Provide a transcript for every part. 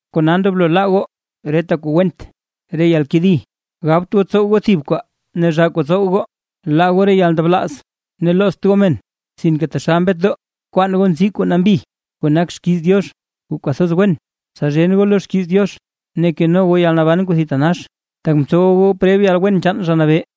Kona, ndoblo laa goo: reta kuu went re yalkedi, gabt goo tsow goo thib kwaa ne zhaa kuu tsow goo, laa goo re yalndablaaz, ne loozt goo men. Sinke taxal mbetdoo, bkwaan goo nzii kuu nambi kuu nak xkiiz Diox kuu kwathoz wen, tsa zhen goo lo xkiiz Diox ne keno goo yalnaban kuu thitanax, tak mtsowa goo preb yalwen chaan Zha Nabee.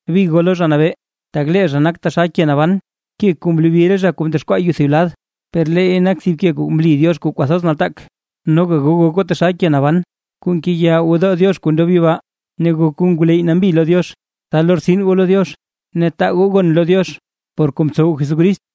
Big goo lo Zha Nabee, tak lee zha nak taxal ke naban. Ke kuu mlobi re zha kuu ndexkwaa yuu thib lad, per leey nak thib ke kuu mli Diox kuu kwathoz nataak. Noga goo gok goo taxal ke naban kuu ngeya gwodoo Diox kuu yibaa, ne gok goo ngwleyy nambi lo Diox, tsa lortsin goo lo Diox ne taa goo gon lo Diox por kuu mtsow Jesucrist.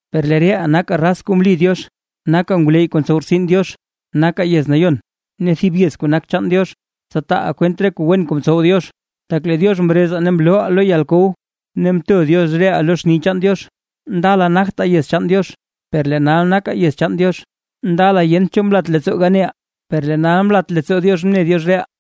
Per lee reʼaa nakaa raz kuu mli Diox, nakaa ngwleyy kuu ntsow rtsin Diox, nakaa yez nayon ne thib yez kuu nak chaan Diox. Tsa taaʼaa kwent re kuu wen kuu mtsow Diox, tak lee Diox mrezaa ne mlooʼaa lo yalkow ne mto Diox reʼaa lo xni chaan Diox. Ndala nagtaa yez chaan Diox, per lee nal nakaa yez chaan Diox; ndala yent cho mlat leettsoo ganeʼaa, per lee nal mlat leettsoo Diox mne Diox reʼaa.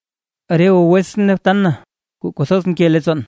Reta goo wetsʼn ne btan na kuu kwathoz nke leettsoon,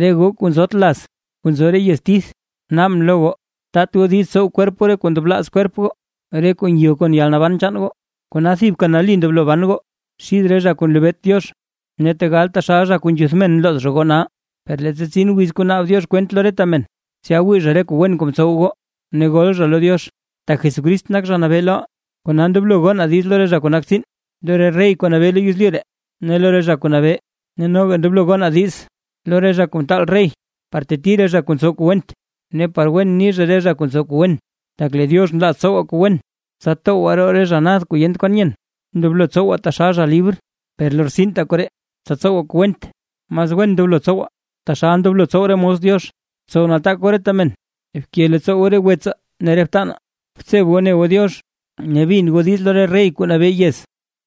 re goo kuu nzot laz kuu nzo re yez tith, naabʼn lo goo, taat goo diiz tsow kwerp goo re kuu ndablaaz kwerp goo, re kuu ngyo kon yalnaban chaan goo. Kona thibka nali ndoblo ban goo xid re zha kuu nlebeet Diox, ne tegal taxal zha kuu nzhuth men nlooz zha goo nal, per leettsa tsin wiz kuu naab Diox kwent lo reta men, tsya wii zha re kuu wen kuu mtsow goo ne gol zha lo Diox. Tak Jesucrist nak Zha Nabee loʼaa, kona ndoblo gonaa diiz lo re zha kuu nak tsiin, lo re rey kuu nabee lo yezlyu ree ne lo re zha kuu nabee, ne noga ndoblo gonaa diiz lo re zha kuu ntaal rey par teti re zha kuu ntsow kuu went, ne par wen ni zha re zha kuu ntsow kuu wen. Tak lee Diox nlaaz tsowaa kuu wen, tsa towgwaa roo re zha nad kuu yent kwan nyen. Ndoblo tsowaa taxal zha libr, per lortsintaa koree, tsa tsowaa kuu went. Mas wen ndoblo tsowaa taxal ndoblo tsow re mos Diox. Btsow nataak goo reta men, bke leettsoo goo re wetsaa ne re btanaa, btseb goo ne goo Diox ne bin goo diiz lo rey kuu nabee yez.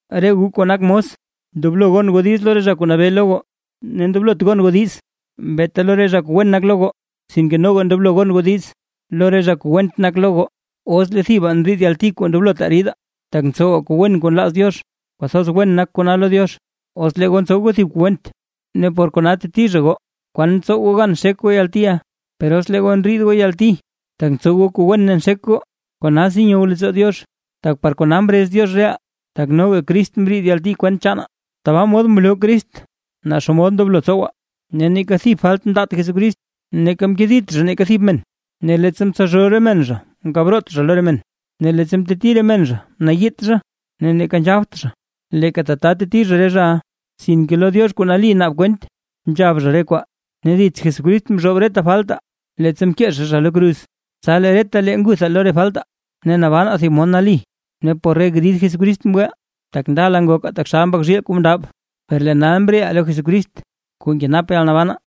Re goo kuu nak mos, ndoblo gon goo diiz lo re zha kuu nabee lo goo, ne ndoblot gon goo diiz beeta lo re zha kuu wen nak lo goo, sinke noga ndoblo gon goo diiz lo re zha kuu went nak. Os lee thibaa ndriid yalti kuu ndoblotaa ridaa, tak ntsowaa kuu wen kuu nlaaz Diox, kwathoz wen nak kona lo Diox. Os lee goo ntsow goo thib kuu went ne por kona teti zha goo, ¿kwan tsow goo gan xek goo yaltiʼa? Per os lee goo ndriid goo yalti, tak ntsow goo kuu wen ne nxek goo, konasi nyow leettsoo Diox. Tak par kona mrez Diox reʼaa, tak noga Crist mriid yalti kwent chaanaa, tabaa mod mloo Crist naa xomod ndoblo tsowaa. Neeka thib falt mndaat Jesucrist, neeka mkedit zha neeka thib men, ne leettsa mtsalzhoo re men zha mkab root zha lo re men; ne leettsa mteti re men zha, mnayiit zha, neeka nzhabt zha leeka tata teti zha re zhaʼa, sinke lo Diox kuu nali naab kwent nzhab zha re kwaa. Ne dits Jesucrist mzhoob reta faltaa, leettsa mkee zha zha lo kruz, tsa lee retalee nguthaa lo re faltaa, ne nabanaa thib mod nali. Ne por re grid Jesucrist mgweʼaa. Tak ndala ngokaa taxal mbak zhiil kuu mndab, per lee nal mreʼaa lo Jesucrist kuu nkenap yalnabanaa.